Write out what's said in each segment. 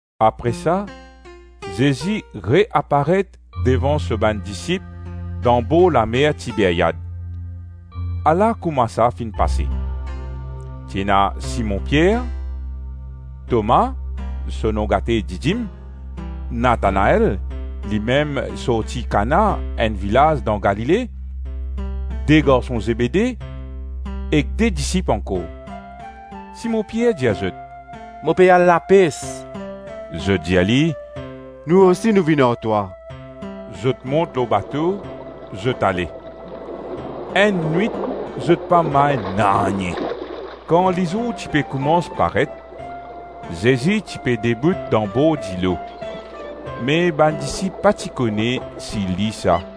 Apre sa, Zezi re-aparet devan so bann disip dan borlamer Tiberiad. Ala kouma sa finn pase. Ti ena Simon Pier, Toma, (so nom gate Didim), Natanael (limem sorti Kana, enn vilaz dan Galile), de garson Zebede ek de disip ankor. Simon Pier dir zot, “Mo pe al lapes.” Zot dir li, “Nou osi, nou vinn ar twa.” Zot mont lor bato, zot ale, enn nwit zot pa may nanye. Kan lizour ti pe koumans paret, Zezi ti pe debout dan bor dilo, me bann disip pa ti kone si li sa.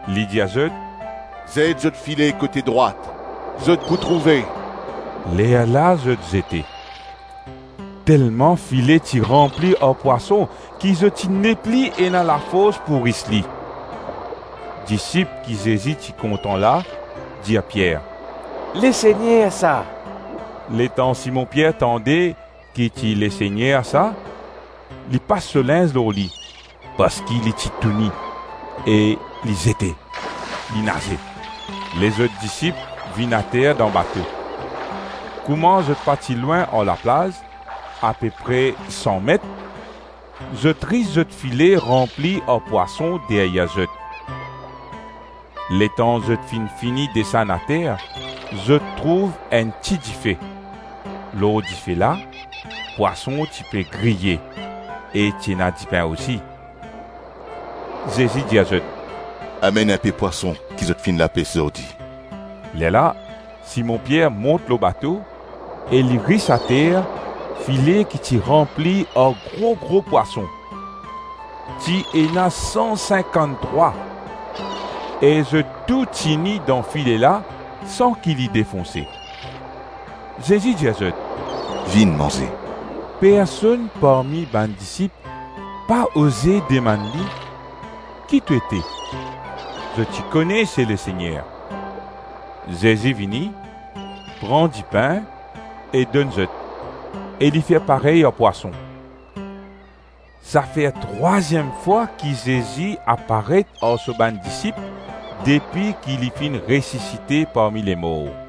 Li dir zot, “Zet zot file kote drwat zot pou trouve.” Lerla zot zete. Telman file ti ranpli ar pwason ki zot ti nepli ena lafors pou ris li. Disip ki Zezi ti kontan la dir Pier, “Lesegner sa.” Letan Simon Pier tande ki ti Lesegner sa, li pas so linz lor li, parski li ti touni, e li zete, li naze. Lezot disip vinn ater dan bato. Kouma zot pa ti lwin ar laplaz, apepre san met, zot ris zot file ranpli ar pwason deryer zot. Letan zot finn fini desann ater, zot trouv enn ti dife; lor dife la pwason ti pe griye e ti ena dipin osi. Zezi dir zot, “Amenn inpe pwason ki zot finn lapes zordi.” Lerla Simon Pier mont lor bato e li ris ater file ki ti ranpli ar gro-gro pwason. Ti ena san sinkann-trwa e zot tou tini dan file la san ki li defonse. Zezi dir zot, “Vinn manze.” Personn parmi bann disip pa oze demann li, “Ki to ete?” Zot ti kone se Lesegner. Zezi vini, pran dipin e donn zot e li fer parey ar pwason. Sa fer trwaziem fwa ki Zezi aparet ar so bann disip depi ki li finn resisite parmi lemor.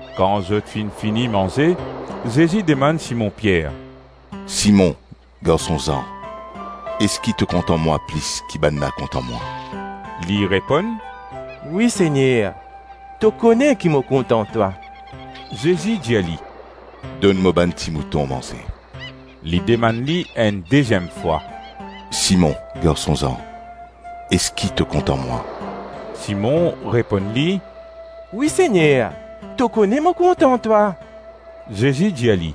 Kan zot finn fini manze, Zezi demann Simon Pier, “Simon garson Zan eski to kontan mwa plis ki bannla kontan mwa?” Li reponn, “Wi Segner, to kone ki mo kontan twa.” Zezi dir li, “Donn mo bann timouton manze.” Li demann li enn deziem fwa, “Simon garson Zan, eski to kontan mwa?” Simon reponn li, “Wi Segner, to kone mo kontan twa.” Zezi dir li,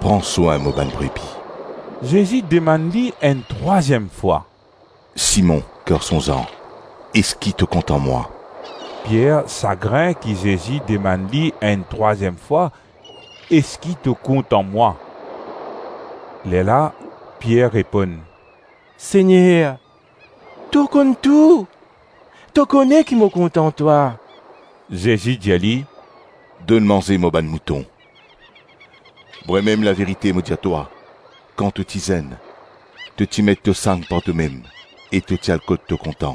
“Pran swin mo bann brebi.” Zezi demann li enn trwaziem fwa, “Simon garson Zan, eski to kontan mwa?” Pier sagrin ki Zezi demann li enn trwaziem fwa, “Eski to kontan mwa?” Lerla Pier reponn, “Segner, to konn tou, to kone ki mo kontan twa.” Zezi dir li, “Donn manze mo bann mouton. Vremem, laverite mo dir twa, kan to ti zenn, to ti met to sang par tomem e to ti al kot to kontan;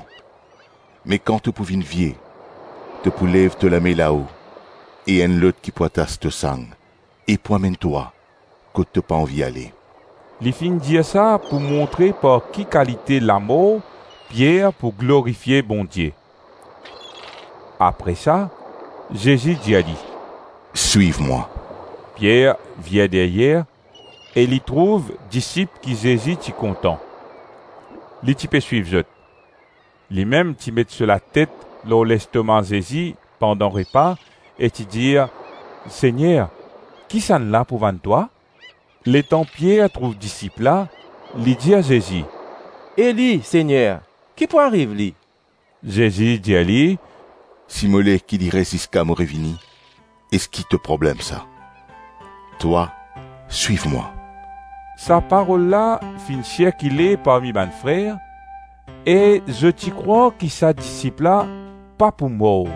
me kan to pou vinn vie, to pou lev to lame lao e enn lot ki pou atas to sang e pou amenn twa kot to pa anvi ale.” (Li finn dir sa pou montre par ki kalite lamor Pier pou glorifie Bondie). Apre sa Zezi dir li, “Swiv mwa.” Pier vir deryer e li trouv disip ki Zezi ti kontan. Li ti pe swiv zot. Limem ti met so latet lor lestoma Zezi pandan repa e ti dir, ‘Segner, kisannla pou vann twa?’ Letan Pier trouv disip la, li dir Zezi, “E li, Segner, ki pou ariv li?” Zezi dir li, “Si mo le ki li res ziska mo revini, eski to problem sa? Twa, swiv mwa.” Sa parol la finn sirkile parmi bann frer e zot ti krwar ki sa disip la pa pou mor;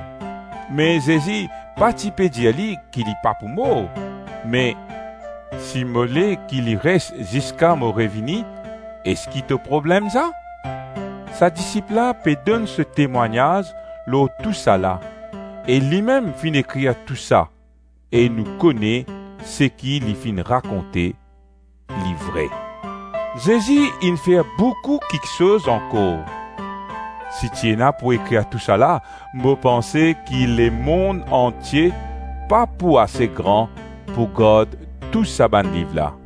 me Zezi pa ti pe dir ki li pa pou mor me, “Si mo le ki li res ziska mo revini, eski to problem sa?” Sa disip la pe donn so temwagnaz lor tousala e limem finn ekrir tou sa e nou kone seki li finn rakonte, li vre. Zezi inn fer boukou kiksoz ankor. Si ti ena pou ekrir tousala, mo panse ki lemonn antie pa pou ase gran pou gard tou sa bann liv la.